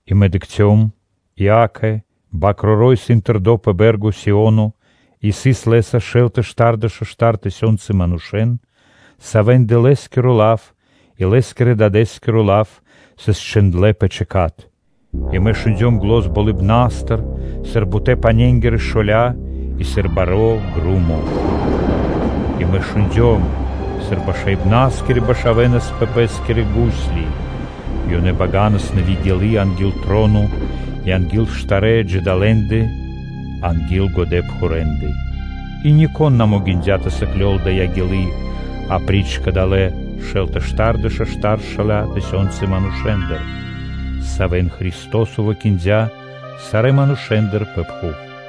И мэ дыкхцём и, акэ, Свэ́нто Бакроро́ исын тэрдо́ пэ бэ́рга Сио́но, и сыс Лэ́са шэл тэ штардэша́ штар тысёнцы манушэ́н, савэ́ндэ Лэ́скиро лав и Лэ́скирэ-Дадэ́скиро лав сыс чхиндлэ́ пэ чэкат. И мэ шундём зан болыбна́стыр, сыр бутэ́-пане́нгирэ шоля́ и сыр баро́ громо. И мэ шундём, сыр башаибнаскирэ башавэнас пэ пэ́скирэ гусли. И ёнэ баганас нэви́ гилы́ анги́л троно и анги́л штарэ́ джидалэндэ (жывотнонэндэ) анги́л годэпхурэндэ. И нико́н на могиндя́ тэ сыклёл дая́ гилы́ апри́ч кадалэ́ шэл тэ штардэша́-штар-шэла́ тысёнцы манушэ́ндэ, савэ́н Христо́со выкиндя сарэ́ манушэ́ндыр пэ пхув.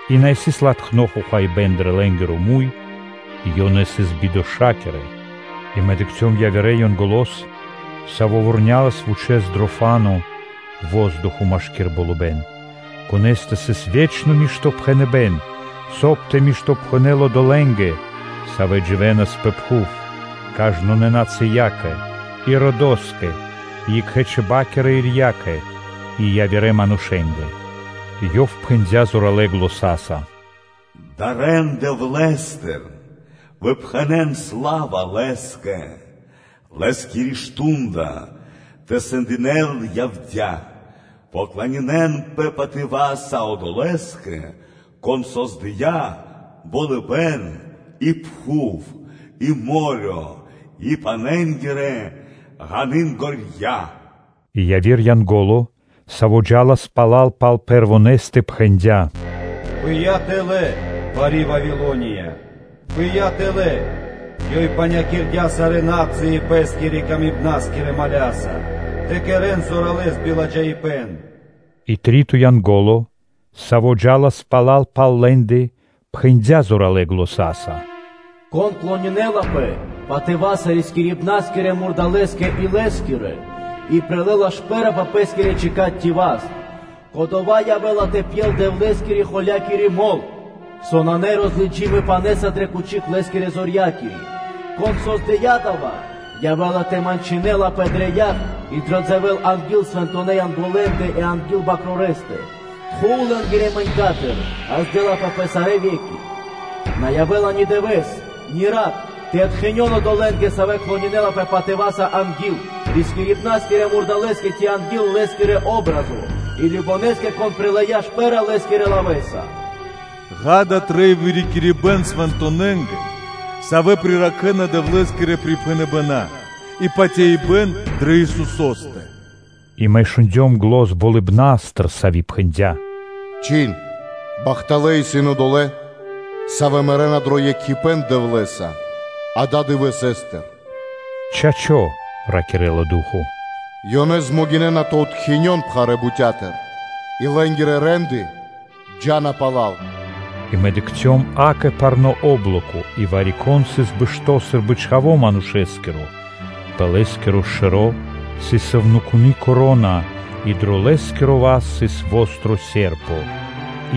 И на сыс латхно хохаибэ́н дро лэ́нгиро муй, ёнэ сыс бидоша́кирэ. И мэ дыкхцём явирэ Янголо́с, саво́ вурнялас вучэ́с дро фа́но (воздухо), машкира́л болыбэ́н, конэ́стэ сыс ве́чно Ева́нгелия, соб (кай) тэ миштопхэнэл одолэ́нгэ, савэ́ дживэ́нас пэ пхув, кажнонэ́ кхэритконэ́ родо́скэ и родыцо́скэ и екхэ́-чиба́кирэ ирья́кэ/сэм΄я́кэ (чибакэ/ чибьякэ) и кажнонэ́-манушытконэ́ нацыя́кэ. Ёв пхэндя́ зоралэ́ заня́са: “Дарэ́н Дэвлэ́стыр, выпхэнэн сла́ва Лэ́скэ! Лэ́скиро мардо́ (шту́нда) тэ сэндякирэ́л явдя́. Поклонинэнпэ патыва́са Одолэ́скэ, Кон создыя́ болыбэ́н и пхув, и мо́рё (дэрья́в) и пане́нгирэ ґанынгорья́.” И яви́р Янго́ло, саво́ джа́лас пала́л пал Пэрвонэстэ, пхэндя́: “Пыя́ тэлэ́, бари Вавилония, пыя́ тэлэ́! Ёй панякирдя сарэ́ на́цыи пэ́скирэ-камибна́скирэ моля́са (виноса) тэ кэрэ́н зоралэ́с биладжаипэ́н.” И три́то Янго́ло, саво́ джа́лас пала́л пал лэ́ндэ, пхэндя́ зоралэ́ заня́са: “Кон клонинэлапэ патыва́са рискирибна́скирэ мурдалэ́скэ и лэ́скирэ патриня́кэ (образо́скэ), и прилэ́ла шпэ́ра пэ пэ́скиро чэкат ци васт, кодова́ явэ́ла тэ пьел Дэвлэ́скирэ-холякири мол, со исын нарозлыджими пане́са дрэ кучик Лэ́скирэ зорьякири! Кон создыя́ дава́, явэ́ла тэ мэнчынэлапэ дрэ яг и дрэ се́ра (дзэвэ́ля) анги́л свэнтонэ́ Янголэндэ и анги́л Свэнтонэ́ Бакрорэстэ. Тхув (дымо) лэ́нгирэ мэнькатыр ґаздэ́лапэ пэ сарэ́ ве́ки. На явэ́ла ни дывэ́с, ни рат тэ откхинён одолэ́нгэ, савэ́ клонинэнапэ патыва́са анги́л рискирибна́скирэ мурдалэ́стэ ци анги́л лэ́скири патри́н (о́бразо), и кажнонэ́скэ (сваконэскэ), кон прилыя́ шпэ́ра лэ́скирэ лавэ́са. Ѓа́да, трэй вырикирибэн свэнтонэнгэ, савэ́ приракхэна Дэвлэ́скирэ припхэныбэна́ и патяибэ́н дрэ Исусо́стэ. И мэ шундём зан болыбна́стыр, сави́ пхэндя́: “Зачхин: ‘Бахталэ́ исын одолэ́, савэ́ мэрэ́на дро екхипэ́н Дэвлэ́са ададывэсэстыр!’” “Чачо́”, – ракирэ́ла Ду́хо. “Ёнэ дэ́на ра́да тэ откинён пхарэ́ бутя́тыр и лэ́нгирэ рэ́нды джа́на пала́л!” И мэ дыкхцём, акэ, парно́ о́блоко, и вари-кон сыс бэшто́ сы́рбы Чхаво́ Манушэ́скиро. Пэ Лэ́скиро шэро́ сыс сувнакуны́ вя́нка (коро́на) и дро Лэ́скиро васт сыс востро (чолало́) серпо (чхиндло́).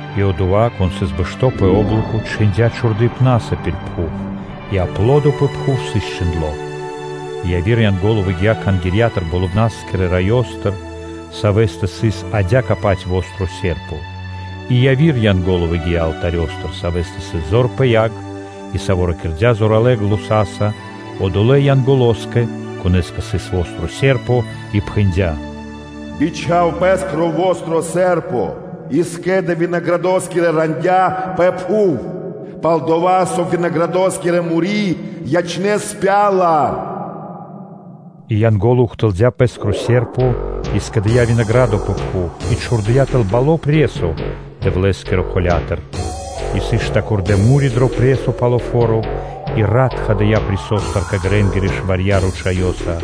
И Одова́, Кон сыс бэшто́ пэ о́блоко, чхиндя́ чхурдыпнаса пир пхув и аплодо пэ пхув сыс счхиндло. И яви́р Янго́ло выгия́ Кхангирья́тыр дро Болыбна́скиро Раё, савэ́стэ сыс адя́кэ-паць востро (чолало́) серпо. И яви́р Янго́ло выгия́ алтарёстыр, савэ́стэ сыс зор пэ яг, и, саво́ ракирдя́ зоралэ́ заня́са одолэ́ Янголоскэ, конэ́стэ сыс востро (чолало́) серпо, и пхэндя́: “Бичха́в пэскро востро (чолало́) серпо и скэ́дэ винаградоскирэ рандя́ пэ пхув, пал-дова́ со винаграды́тка му́ри ячнэ́ спяла.” И Янго́ло ухтылдя пэскро серпо и скэдыя́ винаградо (дракх) пэ пхув и чхурдыя́ тэл баро́ пресо Дэвлэ́скирэ холя́тыр: и сыс штакирдэ (стопчындлэ) му́ри дро пресо, пало́ фо́ро, и рат тхадыя пресостыр кэ грэ́нгирэ шварья́ ручаёса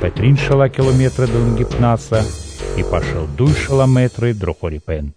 пэ трин шэла́ километры (вэрсты) длэнгипна́са и пашы́л дуй шэла́ мэтры дро хорипэ́н.